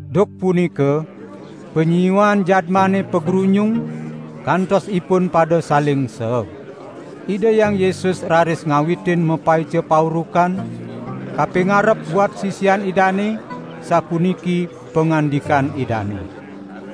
Duk punika panyiuan jadmane pagrunyung, kantos ipun pada saling seeg. Ida Hyang Yesus raris ngawitin mapaica paurukan, kapingarep buat sisian Idane, sapuniki pangandikan Idane: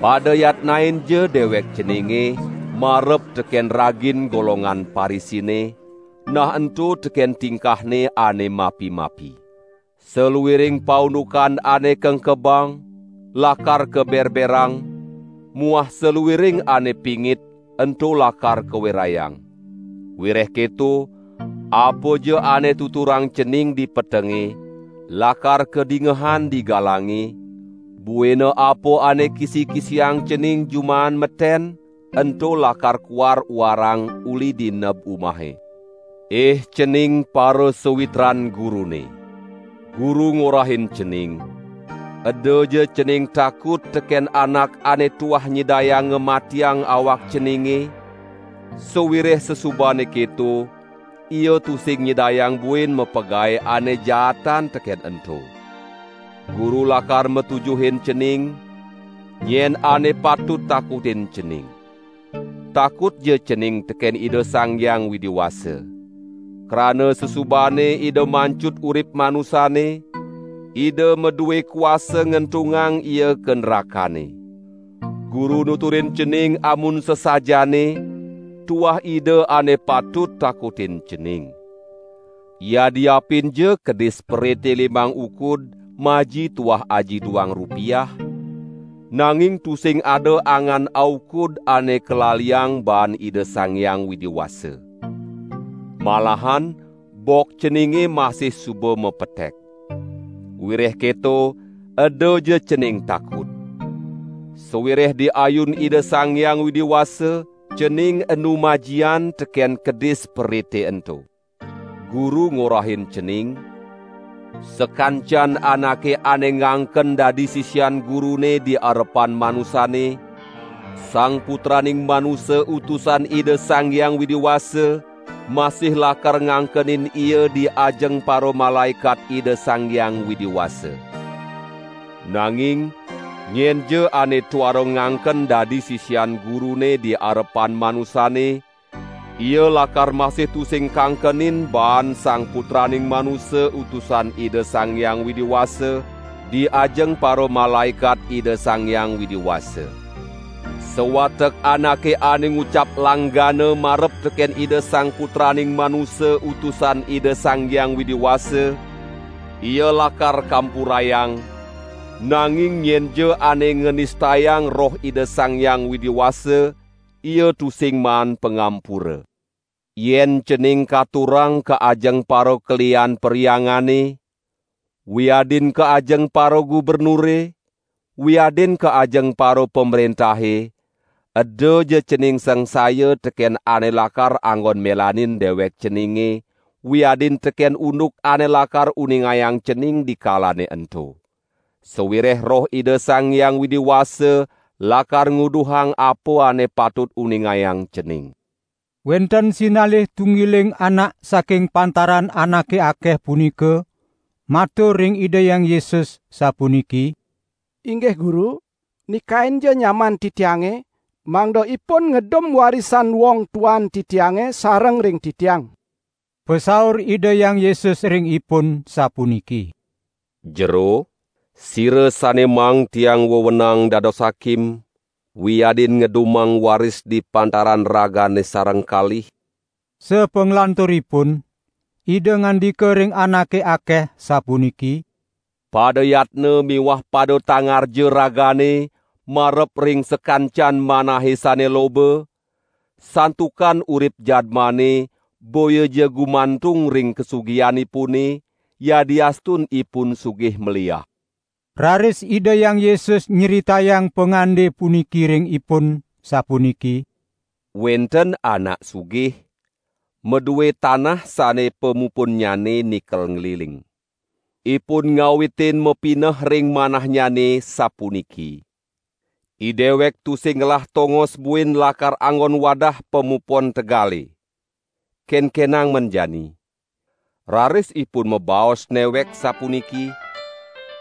"Pada yatnainja dewek ceninge marep teken ragin golongan Parisine, nah ento teken tingkahne ane mapi-mapi. Saluiring paundukan ane kengkebang lakar kaberberang muah saluiring ane pingit ento lakar kawerayang. Wireh keto, apaja ane tuturang cening di petenge, lakar kadingehan di galange, buina apa ane kisi-kisiang cening jumaan meten, ento lakar kuar-uarang uli di neb umahe." "Ih cening parasawitran Gurune! Guru ngorahin cening. Edaja cening takut teken anak ane tuah nyidayang ngamatiang awak ceninge, sawireh sasubane keto ia tusing nyidayang buin mapagae ane jaatan teken ento. Guru lakar matujuhin cening, nyen ane patut takutin cening. Takutja cening teken Ida Sang Hyang Widi Wasa. Krana sasubane Ida mancut urip manusane, Ida madue kuasa ngentungang ia ka nrakane. Guru nuturin cening amun sasajaane, tuah Ida ane patut takutin cening. Yadiapinja kedis perite limang ukud maji tuah aji duang rupiah, nanging tusing ada angan aukud ane kalaliang baan Ida Sang Hyang Widi Wasa. Malahan bok ceninge masih suba mapetek. Wireh keto edaja cening takut! Sawireh di ayun Ida Sang Hyang Widi Wasa cening enu majian teken kedis perite ento." "Guru ngorahin cening, sakancan anake ane ngangken dadi sisian Gurune di arepan manusane, Sang Putraning Manusa Utusan Ida Sang Hyang Widi Wasa masih lakar ngangkenin ia di ajeng paramalaekat Ida Sang Hyang Widi Wasa. Nanging nyenja ane tuara ngangken dadi sisian Gurune di arepan manusane, ia lakar masih tusing kangkenin baan Sang Putraning Manusa Utusan Ida Sang Hyang Widi Wasa, di ajeng paramalaekat Ida Sang Hyang Widi Wasa. Sawatek anake ane ngucap langgana marep teken Ida Sang Putraning Manusa Utusan Ida Sang Hyang Widi Wasa, ia lakar kampurayang, nanging nyenja ane nganistayang Roh Ida Sang Hyang Widi Wasa, ia tusing maan pangampura. Yen cening katurang ka ajeng parakelihan perhyangane, wiadin ka ajeng paragubernure, wiadin ka ajeng parapamrentahe, edaja cening sangsaya teken ane lakar anggon melanin dewek ceninge, wiadin teken unduk ane lakar uningayang cening dikalane ento. Sawireh Roh Ida Sang Hyang Widi Wasa lakar nguduhang apa ane patut ungingayang cening." Wenten sinalih tunggiling anak saking pantaran anake akeh punika, matur ring Ida Hyang Yesus, sapuniki: "Inggih Guru, nikainja nyaman titiange, mangda ipun ngedum warisan wong tuan titiange sareng ring titiang!" Pasaur Ida Hyang Yesus ring ipun, sapuniki: "Jero, sira sane maang Tiang wewenang dados hakim, wiadin ngedumang waris di pantaran ragane sareng kalih?" Sapanglanturipun, Ida ngandika ring anake akeh, sapuniki: "Pada yatna miwah pada tangarja ragane marep ring sakancan manahe sane loba, santukan urip jadmane boyaja gumantung ring kasugihanipune, yadiastun ipun sugih maliah." Raris Ida Hyang Yesus nyritayang pangande puniki ring ipun, sapuniki: "Wenten anak sugih, madue tanah sane pamupunnyane nikel ngliling. Ipun ngawitin mapineh ring manahnyane, sapuniki: 'Idewek tusing ngelah tongos buin lakar anggon wadah pamupon tegale. Kenkenang men jani?' Raris ipun mabaos newek sapuniki: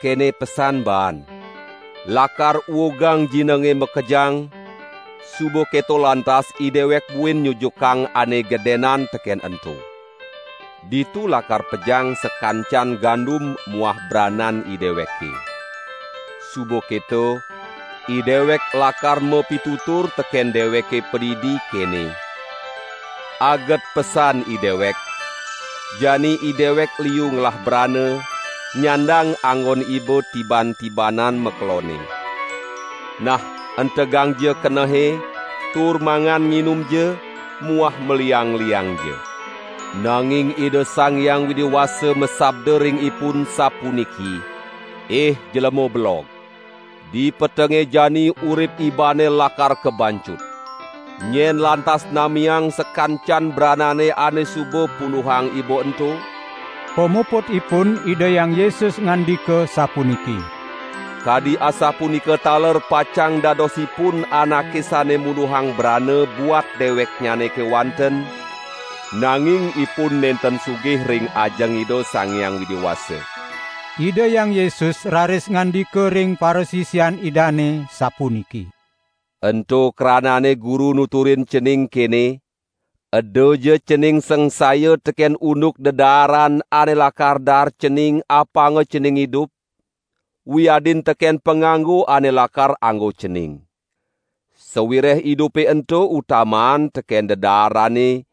'Kene pesan baan! Lakar uugang jinenge makejang, suba keto lantas idewek buin nyujukang ane gedenan teken ento. Ditu lakar pejang sakancan gandum muah branan ideweke. Suba keto, idewek lakar mapitutur teken deweke padidi kene: Aget pesan idewek, jani idewek liu ngelah brana, nyandang anggon iba tiban-tibanan makelonne. Nah entegangja kenehe, tur mangan nginumja, muah maliang-liangja!' Nanging Ida Sang Hyang Widi Wasa masabda ring ipun sapuniki: 'Ih jlema belog! Dipetenge jani urip ibane lakar kabanjut. Nyen lantas namiang sakancan branane ane suba punduhang iba ento?' " Pamuputipun Ida Hyang Yesus ngandika sapuniki: "Kadi asapunika taler pacang dadosipun anake sane munduhang brana buat deweknyane kewanten, nanging ipun nenten sugih ring ajeng Ida Sang Hyang Widi Wasa." Ida Hyang Yesus raris ngandika ring parasisian Idane, sapuniki: "Ento kranane Guru nuturin cening kene: Edaja cening sangsaya teken unduk dedaaran ane lakar daar cening apanga cening idup, wiadin teken panganggo ane lakar anggo cening. Sawireh idupe ento utamaan teken dedaarane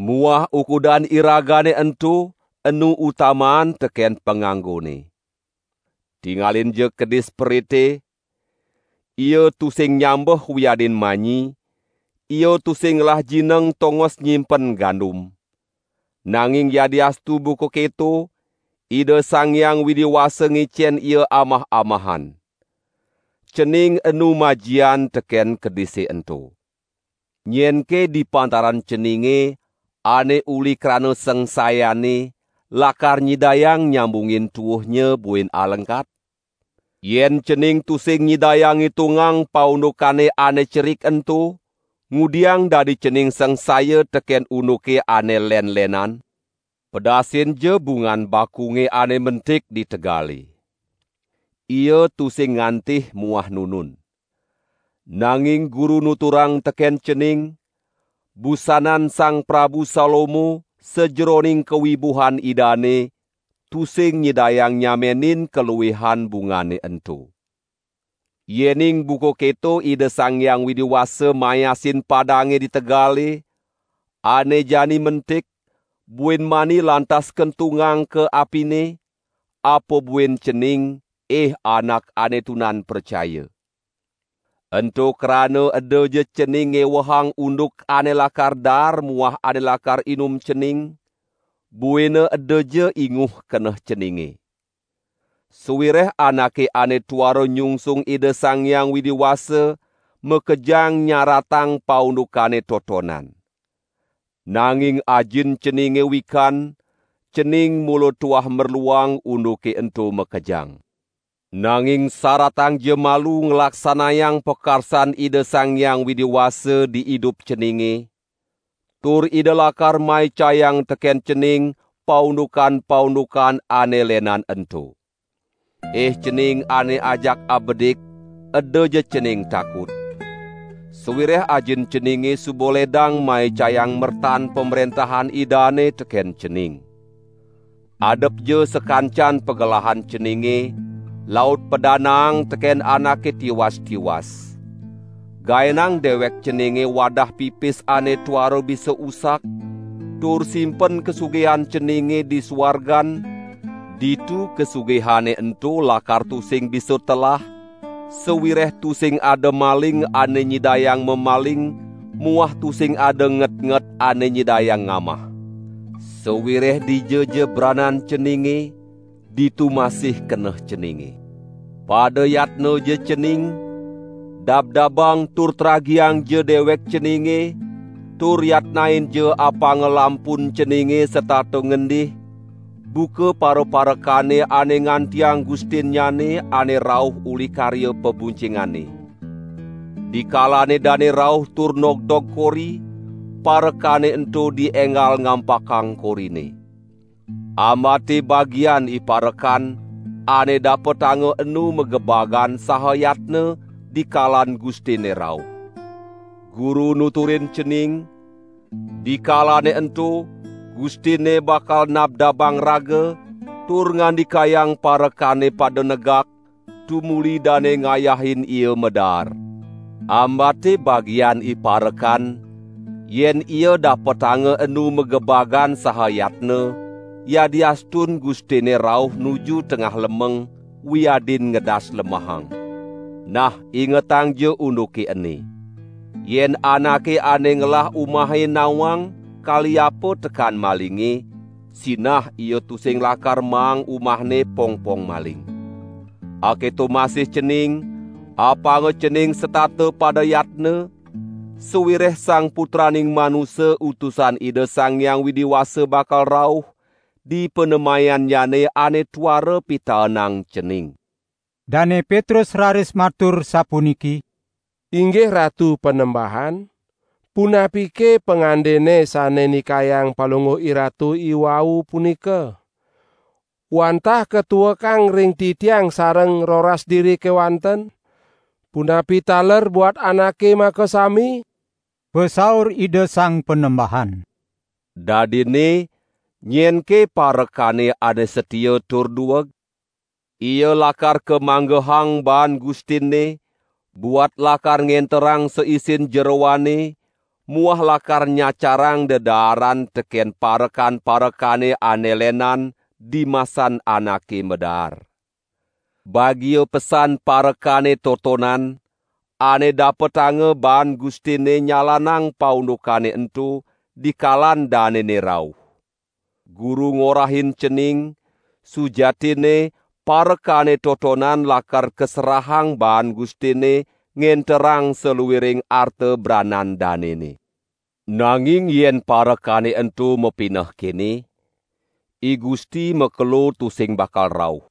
muah ukudan iragane ento enu utamaan teken panganggone. Tingalinja kedis perite: ia tusing nyambeh wiadin manyi, ia tusing ngelah jineng tongos nyimpen gandum. Nanging yadiastu buka keto, Ida Sang Hyang Widi Wasa ngicen ia amah-amahan. Cening enu majian teken kedise ento. Nyenke di pantaran ceninge, ane uli krana sangsayanne, lakar nyidayang nyambungin tuuhnya buin alengkat? Yen cening tusing nyidayang ngitungang paundukane ane cerik ento, ngudiang dadi cening sangsaya teken unduke ane len-lenan? Pedasinja bungan bakunge ane mentik di tegale. Ia tusing ngantih muah nunun. Nanging Guru nuturang teken cening, busanan Sang Prabu Salomo, sajeroning kawibuhan idane, tusing nyidayang nyamenin kaluihan bungane ento. Yening buka keto Ida Sang Hyang Widi Wasa mayasin padange di tegale, ane jani mentik, buin mani lantas kentungang ka apine, apa buin cening, ih anak ane tunan pracaya! Ento krana edaja cening ngewehang unduk ane lakar daar muah ane lakar inum cening, buina edaja inguh keneh ceninge. (Sawireh anake ane tuara nyungsung Ida Sang Hyang Widi Wasa makejang nyaratang paundukane totonan.) Nanging Ajin ceninge wikan, cening mula tuah merluang unduke ento makejang. Nanging saratangja malu nglaksanayang pakarsan Ida Sang Hyang Widi Wasa di idup ceninge, tur Ida lakar maicayang teken cening paundukan-paundukan ane lenan ento." "Ih cening ane ajak abedik edaja cening takut! Sawireh Ajin ceninge suba ledang maicayang mertan Pamrentahan Idane teken cening. Adepja sakancan pagelahan ceninge, laut padanaang teken anake tiwas-tiwas. Gaenang dewek ceninge wadah pipis ane tuara bisa usak, tur simpen kasugihan ceninge di suargan, ditu kasugihane ento lakar tusing bisa telah, sawireh tusing ada maling ane nyidayang mamaling muah tusing ada ngetnget ane nyidayang ngamah. Sawireh dijaja branan ceninge, ditu masih keneh ceninge." "Pada yatnaja cening, dabdabang tur tragiangja dewek ceninge tur yatnainja apanga lampun ceninge setata ngendih, buka paraparekane ane ngantiang gustinnyane ane rauh uli karya pabuncingane. Dikalane dane rauh tur nogdog kori, parekane ento dienggal ngampakang korine. Ambate bagian iparekan, ane dapetanga enu magebagan saha yatna dikalan gustinne rauh. Guru nuturin cening, dikalane ento gustinne bakal nabdabang raga, tur ngandikayang parekane pada negak, tumuli dane ngayahin ia madaar. Ambate bagian iparekan, yen ia dapetanga enu magebagan saha yatna, yadiastun gustinne rauh nuju tengah lemeng, wiadin ngedas lemahang. Nah ingetangja unduke ene! Yen anake ane ngelah umahe nawang kaliapa tekan malinge, sinah ia tusing lakar maang umahne pongpong maling. Aketo masih cening, apanga cening setata pada yatna, sawireh Sang Putraning Manusa Utusan Ida Sang Hyang Widi Wasa bakal rauh, dipanemayannyane ane tuara pitaenang cening." Dane Petrus raris matur sapuniki: "Inggih Ratu Panembahan, punapike pangandene sane nikayang Palungguh IRatu iwau punika, wantah katuekang ring titiang sareng roras diri kewanten, punapi taler buat anake makasami?" Pasaur Ida Sang Panembahan: "Dadinne nyenke parekane ane satia tur dueg? Ia lakar kamanggehang baan gustinne, buat lakar ngenterang saisin jeroanne muah lakar nyacarang dedaaran teken parekan-parekane ane lenan, dimasan anake madaar. Bagia pesan parekane totonan, ane dapetanga baan gustinne nyalanang paundukane ento, dikalan danene rauh. Guru ngorahin cening, sujatinne parekane totonan lakar kaserahang baan gustinne ngenterang saluiring arta branan danene. Nanging yen parekane ento mapineh kene: 'I Gusti makelo tusing bakal rauh.'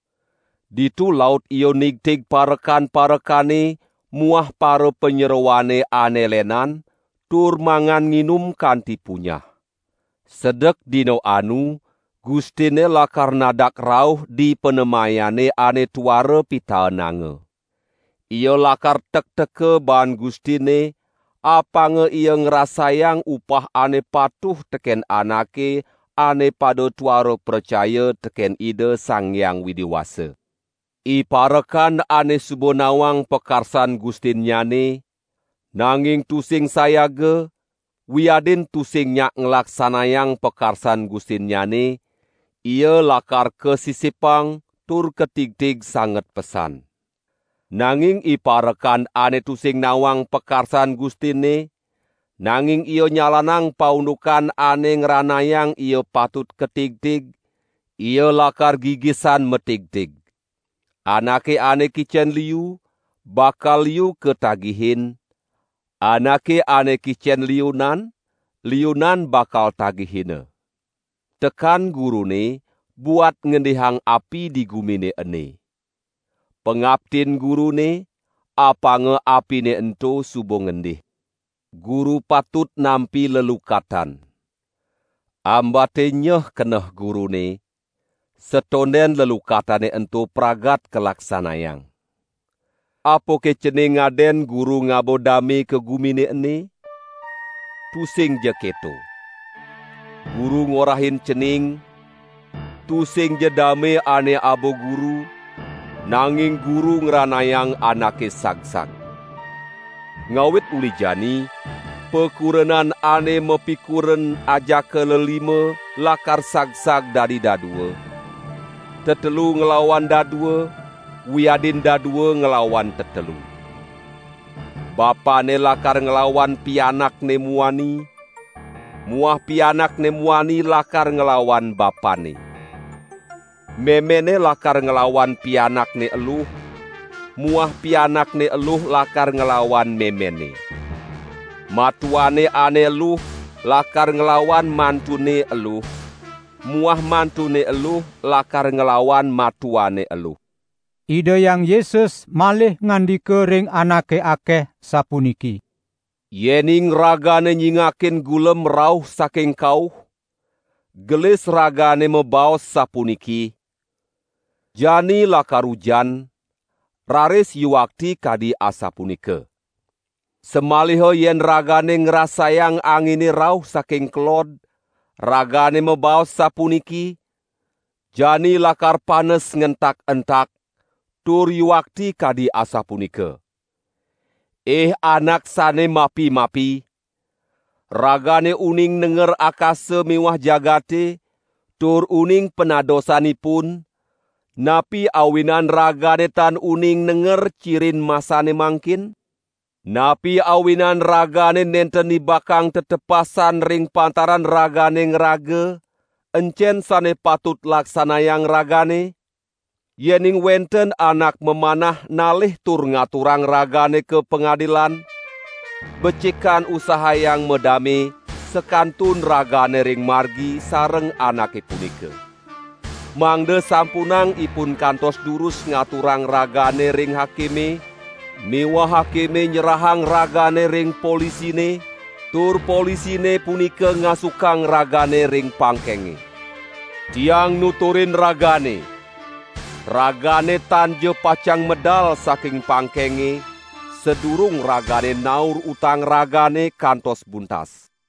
Ditu laut ia nigtig parekan-parekane muah parapanyeroane ane lenan tur mangan nginum kanti punyah. Sedek dina anu, gustinne lakar nadak rauh dipanemayane ane tuara pitaenanga. Ia lakar tekteka baan gustinne, apanga ia ngrasayang upah ane patuh teken anake ane pada tuara pracaya teken Ida Sang Hyang Widi Wasa. Iparekan ane suba nawang pakarsan gustinnyane, nanging tusing sayaga, wiadin tusing nyak nglaksanayang pakarsan gustinnyane, ia lakar kasisipang tur katigtig sanget pesan. Nanging iparekan ane tusing nawang pakarsan gustinne, nanging ia nyalanang paundukan ane ngranayang ia patut katigtig, ia lakar gigisan matigtig. Anake ane kicen liu, bakal liu katagihin, anake ane kicen liunan, liunan bakal tagihina." "Tekan Gurune buat ngendihang api di gumine ene. Pangaptin Gurune, apanga apine ento suba ngendih. Guru patut nampi lelukatan. Ambate nyeh keneh Gurune, satonden lelukatane ento pragat kalaksanayang. Apake cening ngaden Guru ngaba dame ka gumine ene? Tusingja keto. Guru ngorahin cening, tusingja dame ane aba Guru, nanging Guru ngranayang anake sagsag. Ngawit uli jani, pakurenan ane mapikuren ajaka lelima lakar sagsag dadi dadua, tetelu nglawan dadua, wiadin dadua nglawan tetelu. Bapanne lakar nglawan pianakne muani muah pianakne muani lakar nglawan bapanne. Memenne lakar nglawan pianakne eluh muah pianakne eluh lakar nglawan memenne. Matuane ane eluh lakar nglawan mantunne eluh muah mantunne eluh lakar nglawan matuane eluh." Ida Hyang Yesus malih ngandika ring anake akeh, sapuniki: "Yening ragane nyingakin gulem rauh saking kauh, gelis ragane mabaos sapuniki: 'Jani lakar ujan,' raris yuakti kadi asapunika. Samaliha yen ragane ngrasayang angine rauh saking kelod, ragane mabaos sapuniki: 'Jani lakar panes ngentak-entak,' tur yuakti kadi asapunika. Ih anak sane mapi-mapi! Ragane uning nenger akasa miwah jagate tur uning panadosanipun; napi awinan ragane tan uning nenger cirin masane mangkin?" "Napi awinan ragane nenten nibakang tetepasan ring pantaran ragane ngraga, encen sane patut laksanayang ragane? Yening wenten anak mamanah nalih tur ngaturang ragane ka pangadilan, becikan usahayang madame, sakantun ragane ring margi sareng anake punika. Mangda sampunang ipun kantos durus ngaturang ragane ring hakime miwah hakime nyerahang ragane ring polisine, tur polisine punika ngasukang ragane ring pangkenge. Tiang nuturin ragane: 'Ragane tanja pacang medal saking pangkenge, sadurung ragane naur utang ragane kantos buntas.' "